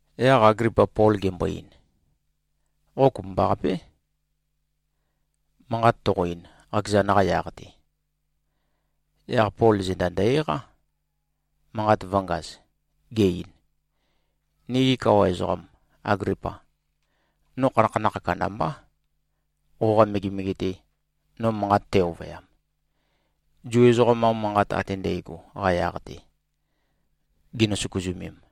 Yaq Aglipa Pol gembo-ein, “Qo kopømbaqapé, manqat toqo-ein, qakezan-qa yaq-te.” Yaq Pol zenda ndø-eqá, manqat vø̄ngaz, ge-ein, “Nigi kawa ezoqam, Aglipa! No khanakhanakh kandambá, qoqa megemege-te, no manqat tæ-ovøyam, Zu ezoqam-qa manqat ate ndægo-qa yaq-te, ginø-søkuzømem.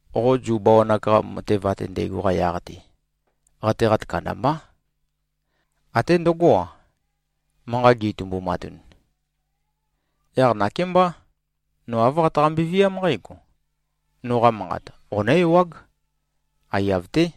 Qo Zu bawan-ak-qa matev ate ndægo-qa yaq-te, qateqat kandambá. Até ndøgó-a, manqa gi꞉-itumbumatun. Yaq nakémbá, no āv qataqambe-viám nqǽgo: Noqa manqat qonǿ-ewág. Aiyav-té.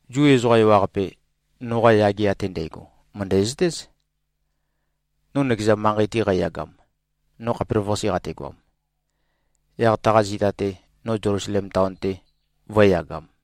Zu ezoqa ewaqape, noqa yage ate ndægo mø̀ndæzøtéz, no nøkeza manqei-te qæyagam, no khapelavøqase qategoam, yaq taqa zita-te, no Zelusalem taon-te vø̄e-yagam.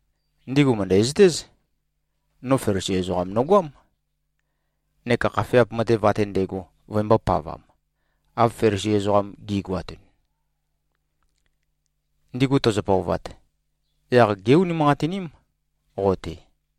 Ndigu mø̀ndæzøtéz. No Felisi ezoqam nogoám, neka khafeap matev ate ndægo vøembō-pavam, av Felisi ezoqam gi꞉goatun. Ndigu tøzø-pøovat, yaq gé-unimanqatiním qo-te.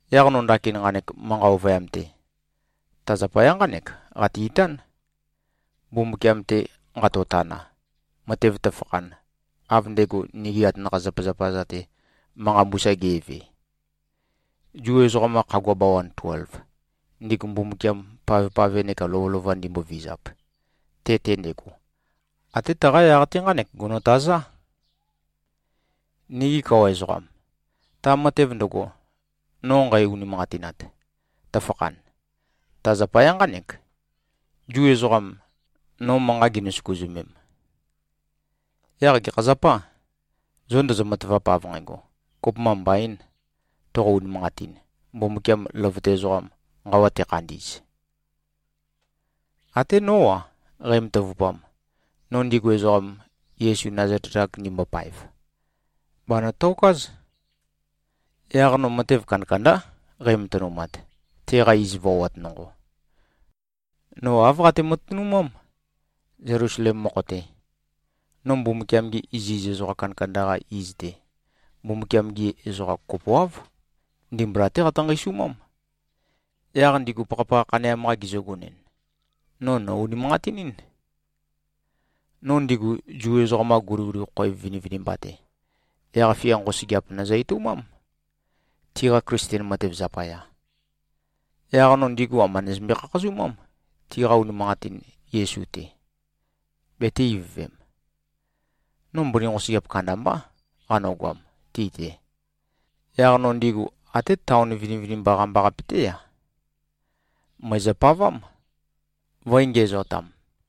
Yaq no ndakin nqanek manqa ovøyam-te, ta zapaya nqánek qate-itán, Mbumbukiam-te nqatotana, matev tøfakhan, av ndego nigi atanakha-zapazapa-za-te manqa mbusa ge꞉ve. Zu ezoqam-qa khagua bawan tuelv, ndigu Mbumbukiam pavpave neka lovølova ndimbovizap, te-te ndego, até taqa yaq-te nqánek gonotazá. Nigi kawa ezoqam! Ta matev ndøgo, no nqæ-unimanqatinat, tøfakhan, ta zapaya nqánek, Zu ezoqam, no manqa ginø-søkuzømem. Yaq gekha zapâ, zo ndozo-matavap, av nqægo, kopømba mbaīn, toqo-unimanqatin, Mbumbukiam løvøte ezoqam, nqawa tekhandi꞉z? Até nó-a, qæmatavupam, no ndigu ezoqam, Yesu Nazalet-ak ndimbopaev, bànøtokáz. Yaq no matev kandakandá qæmatønumat, teqa iz voat nonqo. No āv qate-matønumám, Zelusalem mokho-te. No Mbumbukiam-gi iziz ezoqa kandakanda-qa iz-te, Mbumbukiam-gi ezoqam kopoáv, ndimbula-té qatø-nqeisumám. Yaq ndigu pakhapakha khaneam-qa gizøgonɨn, no nò-unimanqatinín. No ndigu Zu ezoqam-qa guliguli khoev vinivinimba-te, yaq-fia nqosøgeap nøzø-etoumám, tiqa Klisten matev zapaya. Yaq no ndigu amba nøzømbe-khakhazumám, tiqa unimanqatin Yesu-te, betē-ivøvem. No mbøni nqosøgeap kandambá, qanøgoam ti-te. Yaq no ndigu, até taon vinivinimba qambaqape-té-a, mø̀ezøpavám, vø̄e-ngiæzotam.”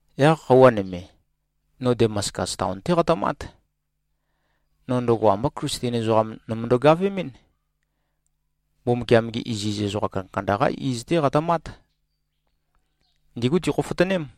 “Yaq khøuwa nøme, no Damaskus taon-té qatømát. No ndøgo ambá Klisten ezoqam nømøndo-gavemɨ́n. Mbumbukiam-gi iziz ezoqa kandakanda-qá iz-té qatømát. Ndígu tikhofotøném.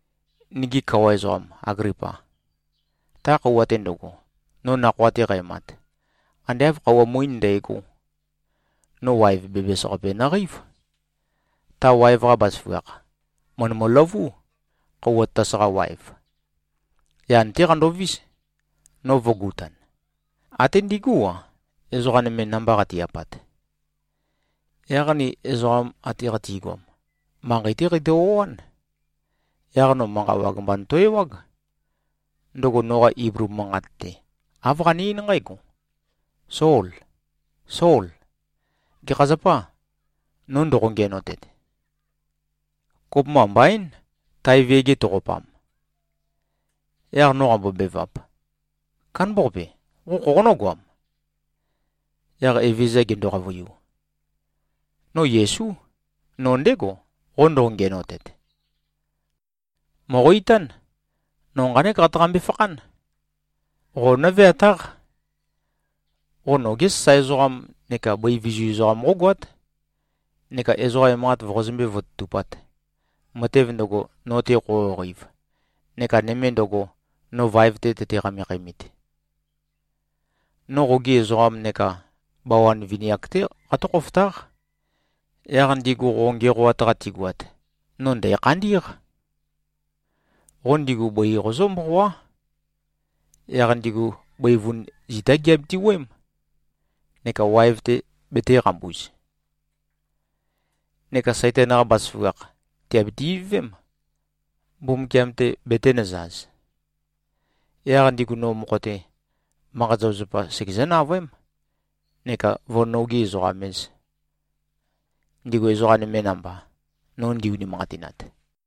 Nigi kawa ezoqam, Aglipa! Ta khøuwa-te ndøgo, no nakhoa-te qæmat, ande āv khøuwa muín ndægó, no waev bæbæs-qape nøqeív. Ta waev-qa bazaføgakh, mø̀ndøløvú, khøuwa tatas-qa waev. Yan-té qandovís, no vø̄gutan, até ndigú-a, ezoqa nøme namba qati-apat. Yaq ni ezoqam ate qatigoam, manqei-té qeitø-o꞉án. Yaq no manqa wag mba noto-ewág. Ndøgo noqa Iblu manqat-te, āv qane-eín nqǽgo, ‘Sol! Sol! Gekha zapâ, no ndoqo-ngiænotet? Kopømba mbaín, tae viæge toqopam.’ Yaq no qambobevap, ‘Kándambaqape. Qo khoqonǿ-goam?’ Yaq Evezøza gendo-qavøiu, ‘No Yesú. No ndégo, qo ndoqo-ngiænotet. Mòqo-itán! No nqánek qataqambe-fakhán. Qo nǿveatáq. Qo nogé sasae ezoqam neka bøi vizu ezoqam qógoát, neka ezoqa emanqat voqozømbé-vototupāt, matev ndøgo, no-te qoqoqeiv neka nøme ndøgo, no vaev-te tøte-qamekhæmit. No qogi ezoqam neka bawan vini-ak-té qatǿ-khofotáq. Yaq ndigu qo ngiæqoat-qa tigoat, no ndæ̀khandí꞉q. Qo ndigu bøi qozǿ-mboqoá. Yaq ndigu bøivun zitá giabiti-wuøém, neka waev-te betēqambuz. Neka Saitan-qa bazaføgakh, tìabiti-ivøvém, Mbumbukiam-te betēnøzaz. Yaq ndigu no mokho-te, manqa-zapazapa segezǿ-navøém, neka vǿ-nogi-ezoqam-ēz, ndigu ezoqa nøme namba, no ndi-unimanqatinat.’”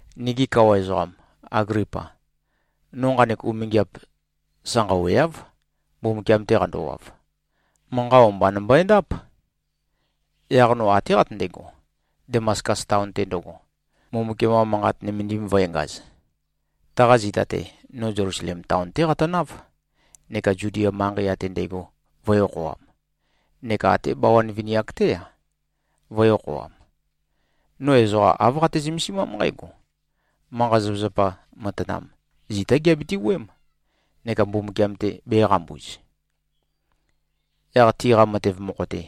“Nigi kawa ezoqam, Aglipa! No nqanek umingiap sanqaweáv, Mbumbukiam-te qandowav. Manqa o-mba nømbøendáp. Yaq no até qatøndego, Damaskus taon-te ndøgo, Mbumbukiam-qa Manqat nømendim vø̄engaz. Taqa zita-te, no Zelusalem taon-té qatønáv neka Zudia manqei ate ndægo vø̄e-okhoam, neka até bawan vini-ak-té-a, vø̄e-okhoam. No ezoqa āv qate-zømesimám nqǽgo: Manqa-zapazapa matanam, zitá giabiti-wuøém, neka Mbumbukiam-te bēqambuz. Yaq tiqa matev mokho-te,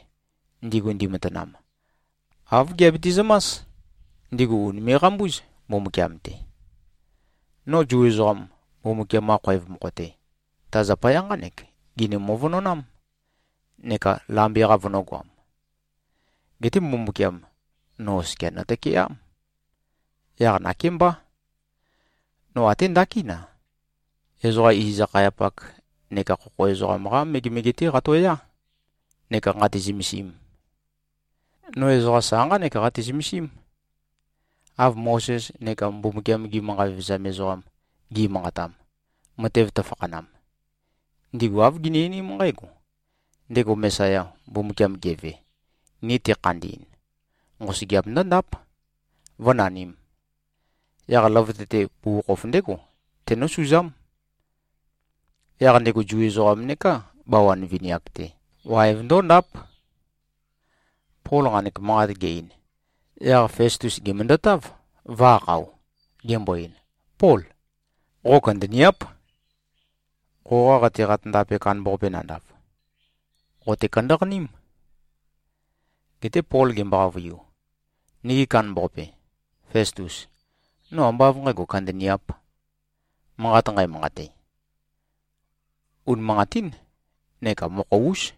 ndigu ndimatanam, āv giabiti-zømás, ndigu ùnime꞉-qambúz, Mbumbukiam-te. No Zu ezoqam, Mbumbukiam-qa khoev mokho-te, ta zapaya nqánek gini-møvønonám, neka lambe-qa vønø̄goam. Geté Mbumbukiam, no oskia nøtøkeám. Yaq nakémbá, no até ndakín-a, ezoqa iz-akhayapak neka khokho ezoqam-qá megemege-té qatoyá, neka nqātē-zø̄mēsīm. No ezoqa sa nqánek qate-zømesím, av Mozes neka Mbumbukiam-gi manqa vevezam ezoqam gi꞉manqatam, matev tøfakhanam. Ndigu āv gini-einím nqǽgo: Ndego Mesaya, Mbumbukiam geve, ni tekhandi꞉n, nqosøgeap ndǿndáp, vǿnanīm. Yaq løvøte-te, bugukhokhof ndégo tenǿsuzám. Yaq ndego Zu ezoqam neká bawan vini-ak-te, waev ndóndáp.” Pol nqanek manqat ge-ein, yaq Festus gèmøndøtáv, vø̄-akhao. Gembo-ein, “Pól. Qo kandaniáp. Qoqa qateqat ndape kandambaqape nandav, qòte-kandaqaním.” Geté Pol gembo-qavøiu, “Nigi kandambaqape, Festus! No ambá av nqægo, kandaniāp. Manqat nqæmanqate, unimanqatín neka mokho-ús.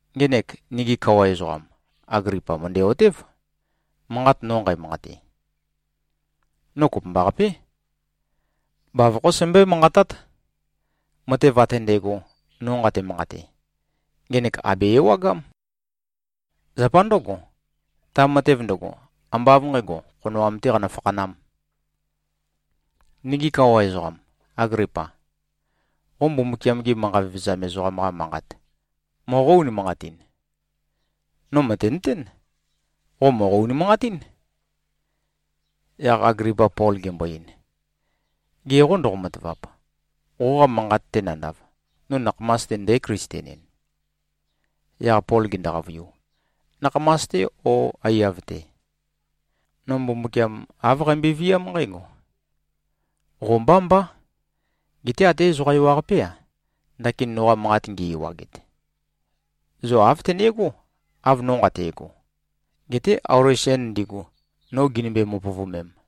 Ngenek, nigi kawa ezoqam, Aglipa, mø̀ndæ-otév, manqat no nqæmanqate. No kopømbaqapé, bavokhó sæmbøé-manqatát. Matev ate ndægo, no nqate-manqate, ngenek àbe-ewagám. Zapa ndǿgo, ta matev ndøgo, ambá av nqǣgo, khonoam-tē qanø-fakhanām. Nigi kawa ezoqam, Aglipa! Qo Mbumbukiam-gi manqa vevezam ezoqam-qa manqat moqó-unimanqatin? No mø̀tenøtén. Qo mòqo-unimanqatín.” Yaq Aglipa Pol gembo-ein, “Ge qô, ndoqo-matavap, qoqa manqat-te nandav, no nakhamas-te ndǽ-Klisten-en?” Yaq Pol gendo-qavøiu, “Nakhamas-te ó aiyav-te. No Mbumbukiam, āv qambøe-viám nqǽgo: Qo mbá mbá. Geté até ezoqa ewaqapé-a, ndakin noqa manqat ngi-ewaget, zo āv tøne꞉gó, av no nqate꞉go. Geté auli sen ndigu, no ginømbe-mopøvømem.”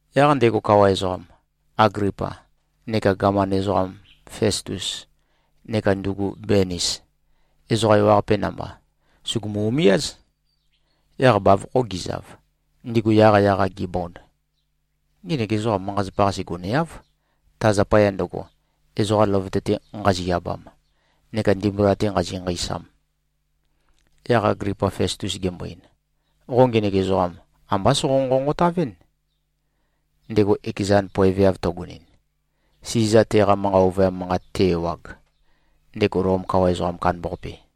Yaq ndego kawa ezoqam, Aglipa, neka gaman ezoqam Festus neka ndugu Benis, ezoqa ewaqape namba, sùgumu-umiáz. Yaq bavokho gizav, ndigu yaqyaq-a gibond, “Ngenek ezoqam manqa-zapa-qase goneáv, ta zapaya ndøgo, ezoqa løvøte-te nqazi-abam neka ndimbula-te nqazi-nqeisam.” Yaq Aglipa Festus gembo-ein, “Qo ngenek ezoqam ambá soqo-nqonqotavɨ́n, ndego ekezan poeveav tøgonɨn, Siza teqa manqa ovøyam manqat te-ewag, ndego Lom kawa ezoqam kandambaqape.”